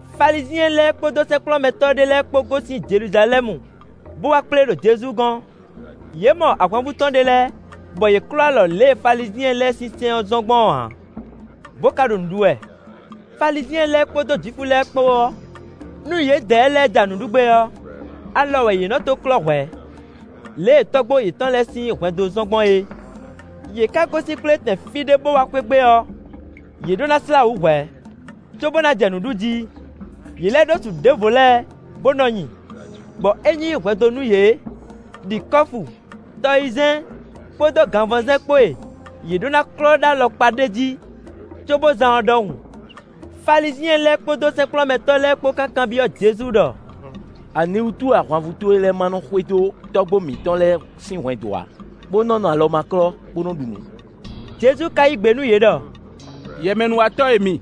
Falizyɛn lɛ́ɛ kpódó sɛ́nkplɔ́nmɛtɔ́ ɖé lɛ́ɛ kpó gosín Jeluzalɛ́mu bó wá kplé ɖo Jezu gɔ́n. Yě mɔ ahwanvú tɔn ɖé lɛ́ɛ bɔ yě klɔ́ alɔ lě e Falizyɛn lɛ́ɛ sín sɛ́n ɔ́ zɔ́n gbɔn ɔ́ ǎ, bó ka ɖo nǔ ɖu wɛ. Falizyɛn lɛ́ɛ kpódó Jwifu lɛ́ɛ kpó ɔ́, nú yědɛɛ lɛ́ɛ ja nǔ ɖu gbé ɔ́, alɔ wɛ yě nɔ́ tó klɔ́ hwɛ̌, lě e tɔ́gbó yětɔn lɛ́ɛ sín hwɛndo zɔ́n gbɔn é. Yě ka gosín kplétɛn fí ɖé bó wá xwé gbe ɔ́, yě ɖó ná slá wǔ hwɛ̌, cóbó ná jɛ nǔ ɖu jí. Yě lɛ́ ɖó su ɖěvo lɛ́ɛ bó nɔ́ nyi, bɔ é nyí hwɛndo nú yě, ɖi kɔ́fu, tɔyizɛ́n kpódó ganvɔzɛ́n kpó e yě ɖó ná klɔ́ ɖó alɔkpa ɖé jí, cóbó zán ɔ́ ɖɔhun. Falizyɛn lɛ́ɛ kpódó sɛ́nkplɔ́nmɛtɔ́ lɛ́ɛ kpó ká kanbyɔ́ Jezu ɖɔ: “Aniwútu wɛ ahwanvú towe lɛ́ɛ ma nɔ xwedó tɔ́gbó mǐtɔn lɛ́ɛ sín hwɛndo ǎ, bó nɔ́ nɔ alɔ ma klɔ́, bó nɔ́ ɖu nǔ?” Jezu ka yí gbe nú yě ɖɔ: “Yɛmɛnúwatɔ́ e mi!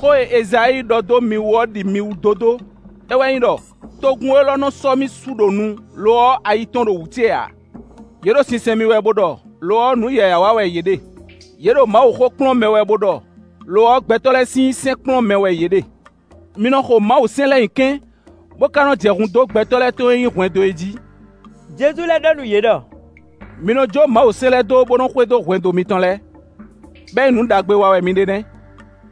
Xó e Ezayíi ɖɔ dó mi wú ɔ́ ɖi mi wú dódó; é wɛ nyí ɖɔ: ‘Togun élɔ́ nɔ sɔ́ mi su ɖo nu, lo ɔ́, ayi tɔn ɖo wǔ ce ǎ. Yě ɖo sinsɛn mì wɛ bo ɖɔ, lo ɔ́, nǔ yǎyá wa wɛ yě ɖe; yě ɖo Mawuxó kplɔ́n mɛ wɛ bo ɖɔ, lo ɔ́, gbɛtɔ́ lɛ́ɛ sín sɛ́n kplɔ́n mɛ wɛ yě ɖe.’ Mi nɔ xo Mawusɛ́n lɛ́ɛ nyi kɛ́n, bó ká nɔ́ jɛ hun dó gbɛtɔ́ lɛ́ɛ tɔn e nyí hwɛndo é jí.” Jezu lɛ́ ɖɔ nú yě ɖɔ: “Mi nɔ jó Mawusɛ́n lɛ́ɛ dó, bó nɔ́ xwedó hwɛndo mitɔn lɛ́ɛ, bɔ é nyí nǔ ɖagbe wa wɛ mi ɖe nɛ́.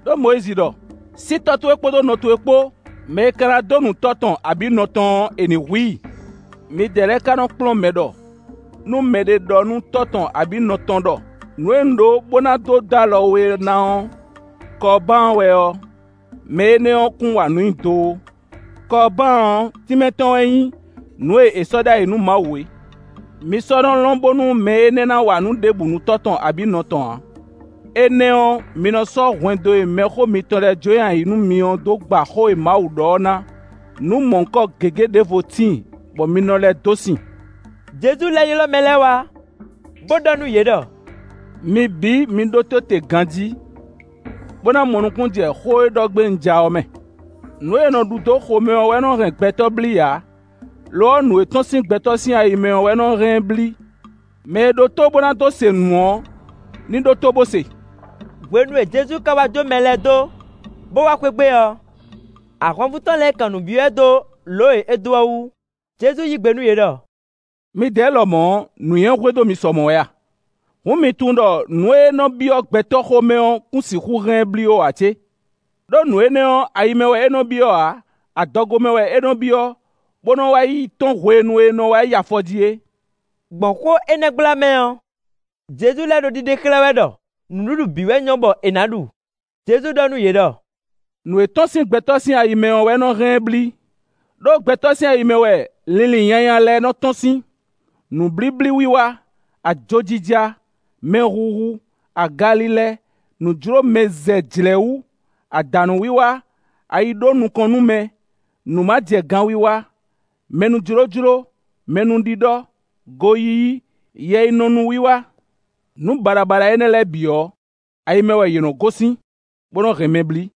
Đó Mɔyízi ɖɔ: ‘Sí tɔ́ towe kpódó nɔ towe kpó; mɛ e ka ná dó nu tɔ́ tɔn abǐ nɔ tɔn ɔ́, è nǐ hu i.’ Midɛɛ lɛ́ɛ ka nɔ́ kplɔ́n mɛ ɖɔ nú mɛɖé ɖɔ nú tɔ́ tɔn abǐ nɔ tɔn ɖɔ: ‘Nǔ e un ɖó bó ná dó dó alɔ we ná ɔ́, Kɔbaan wɛ’ ɔ́, mɛ énɛ́ kún wa nǔ nyi do ó. (Kɔbaan ɔ́, tínmɛ tɔn wɛ nyí: nǔ e è sɔ́ ɖ'ayǐ nú Mawu é.) Mi sɔ́ nɔ́ lɔn bónú mɛ énɛ́ ná wa nǔ ɖěbǔ nú tɔ́ tɔn abǐ nɔ tɔn ǎ. Énɛ́ ɔ́, mi nɔ sɔ́ hwɛndo e mɛxó mitɔn lɛ́ɛ jó nyi ayǐ nú mi ɔ́ dó gba xó e Mawu ɖɔ ɔ́ ná; nǔ mɔ̌hunkɔ gěgé ɖěvo tíin, bɔ mi nɔ lɛ́ dó sin.” Jezu lɛ́ ylɔ́ mɛ lɛ́ɛ wá, bó ɖɔ nú yě ɖɔ: “Mi bǐ, mi ɖótó te ganjí, bó ná mɔ nukúnnú jɛ xó e ɖɔ gbé un ja ɔ́ mɛ. Nǔ e è nɔ ɖu dó xomɛ ɔ́ wɛ nɔ́ hɛn gbɛtɔ́ blí ǎ; lo ɔ́, nǔ e tɔ́n sín gbɛtɔ́ sín ayi mɛ ɔ́ wɛ nɔ́ hɛn ɛ blí. [ Mɛ e ɖó tó bó ná dó se nǔ ɔ́ ní ɖótó bó se.”] Hwenu e Jezu ka wá jó mɛ lɛ́ɛ dó, bó wá xwé gbe ɔ́, ahwanvú tɔn lɛ́ɛ kan nǔ byɔ́ ɛ dó lǒ e é dó ɔ́ wú. Jezu yí gbe nú yě ɖɔ: “Midɛɛ lɛ́ɛ lɔmɔ̌ ɔ́, nǔnywɛ́ hwedó mi sɔ mɔ̌ wɛ a? Hǔn mi tunwun ɖɔ nǔ e nɔ́ byɔ́ gbɛtɔ́ xomɛ ɔ́ kún sixú hɛn ɛ blí ó ǎ cé? Đó nǔ énɛ́ ɔ́, ayi mɛ wɛ é nɔ́ byɔ́ ǎ, adɔgo mɛ wɛ é nɔ́ byɔ́, bó nɔ́ wá yi tɔ́n hwenu è nɔ wá yi afɔ jí é.” (Gbɔn xó énɛ́ gbla mɛ ɔ́, Jezu lɛ́ ɖo ɖiɖe xlɛ́ wɛ ɖɔ nǔɖuɖu bǐ wɛ nyɔ́ bɔ è nǎ ɖu.) Jezu ɖɔ nú yě ɖɔ: “Nǔ e tɔ́n sín gbɛtɔ́ sín ayi mɛ ɔ́ wɛ nɔ́ hɛn ɛ blí; ɖó gbɛtɔ́ sín ayi mɛ wɛ linlin nyanya lɛ́ɛ nɔ́ tɔ́n sín; nǔblíblíwiwa, ajojija, mɛhuhu, agalilɛ, nǔjlómɛzɛjlɛ̌wú, adǎnúwiwa, ayiɖónukɔnnúmɛ, nǔmajɛganwiwa, mɛnújlójló, mɛnúɖiɖɔ, goyíyí, yɛyinɔnúwiwa nǔ baɖabaɖa énɛ́ lɛ́ɛ bǐ ɔ́, ayi mɛ wɛ yě nɔ́ gosín, bó nɔ́ hɛn mɛ blí.”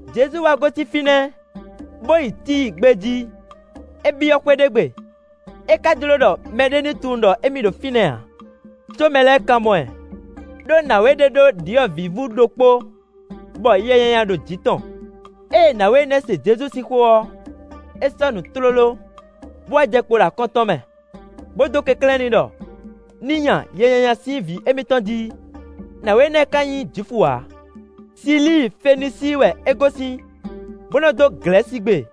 Jezu wá gosín fínɛ́, bó yi Tíi gbé jí. É byɔ́ xwé ɖé gbe, é ká jló ɖɔ mɛɖé ní tunwun ɖɔ émí ɖo fínɛ́ ǎ, có mɛ lɛ́ɛ ka mɔ ɛ. Đó nǎwe ɖé ɖó ɖyɔ̌vǐvú ɖokpó, bɔ yɛ nyanya ɖo jǐ tɔn; ée nǎwe énɛ́ ɔ́ se Jezu sín xó ɔ́, é sɔ́nǔ tlóló, bó wá jɛ kpo ɖo akɔ́n tɔn mɛ, bó dó kɛnklɛ́n n'i ɖɔ ní nya yɛ nyanya sín vǐ émítɔn jí. Nǎwe énɛ́ ká nyí Jwifu ǎ; Silíi-Fenisíi wɛ é gosín, bó nɔ́ dó Glɛ̌sigbe.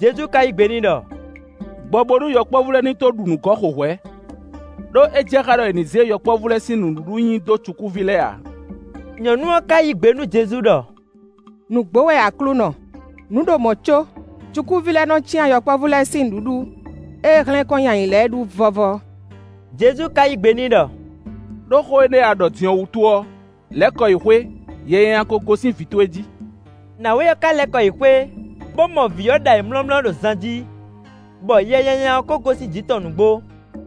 Jezu ka yí gbe n'i ɖɔ: “Gbɔ bónú yɔkpɔ́vú lɛ́ɛ ní tó ɖu nǔ gɔ́ xo hwɛ̌; ɖó é jɛ xá ɖɔ è nǐ zé yɔkpɔ́vú lɛ́ɛ sín nǔɖuɖu nyi dó cukúví lɛ́ɛ ǎ.” Nyɔ̌nu ɔ́ ká yí gbe nú Jezu ɖɔ: “Nǔgbó wɛ Aklúnɔ; nǔ ɖo mɔ̌ có cukúví lɛ́ɛ nɔ́ cyán yɔkpɔ́vú lɛ́ɛ sín nǔɖuɖu e hlɛ́n kɔn nyi ayǐ lɛ́ɛ ɖu vɔ́vɔ́.” Jezu ka yí gbe n'i ɖɔ: “Đó xó énɛ́ e a ɖɔ din ɔ́ wútu ɔ́, lɛ́ kɔ yi xwé, yɛ nyanya ko gosín vǐ towe jí.” Nǎwe ɔ́ ká lɛ́ kɔ yi xwé, bó mɔ vǐ ɔ́ ɖo ayǐmlɔ́mlɔ́ ɖo zan jí, bɔ yɛ nyanya ɔ́ ko gosín jǐ tɔn nǔgbó.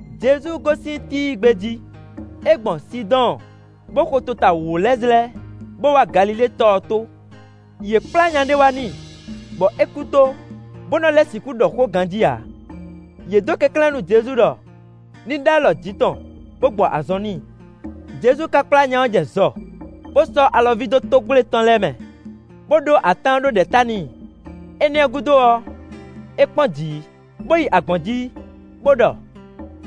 Jezu gosín Tíi gbé jí; é gbɔn Sidɔ́ɔn, bó xo tota wǒ lɛ́ɛ zlɛ́, bó wá Galilée tɔ ɔ́ tó. Yě kplá nya ɖé wá n'i, bɔ é kú tó, bó nɔ́ lɛ́ sixú ɖɔ xó ganjí ǎ. Yě dó kɛnklɛ́n nú Jezu ɖɔ ní ɖó alɔ jǐ tɔn, bó gbɔ azɔn n'i. Jezu ka kplá nya ɔ́ jɛ zɔ, bó sɔ́ alɔví dó tógwle tɔn lɛ́ɛ mɛ, bó ɖó atán ɖó ɖɛ̌ ta n'i. Énɛ́ ɔ́ gúdo ɔ́, é kpɔ́n jǐ, bó yi agbɔ̌n jí, bó ɖɔ: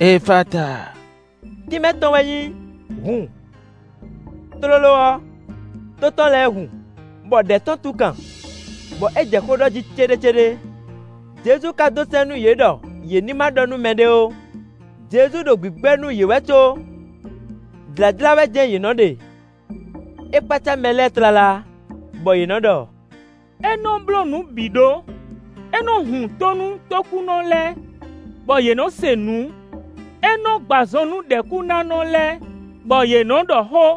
“Efata” (tínmɛ tɔn wɛ nyí: “Hun.”) Tlóló ɔ́, tó tɔn lɛ́ɛ hun, bɔ ɖɛ̌ tɔn tún kan, bɔ é jɛ xó ɖɔ jí céɖécéɖé. Jezu ka dó sɛ́n nú yě ɖɔ yě ní ma ɖɔ nú mɛɖé ó; Jezu ɖo gbǐgbɛ́ nú yě wɛ có, jlǎjlá wɛ jɛ́n yě nɔ ɖe. É kpácá mɛ lɛ́ɛ tlala, bɔ yě nɔ ɖɔ: “É nɔ́ bló nǔ bǐ ɖó. É nɔ́ hun tó nú tókúnɔ lɛ́ɛ, bɔ yě nɔ́ se nǔ; é nɔ́ gbɔ azɔn nú ɖɛ̌kúnánɔ lɛ́ɛ, bɔ yě nɔ́ ɖɔ xó.”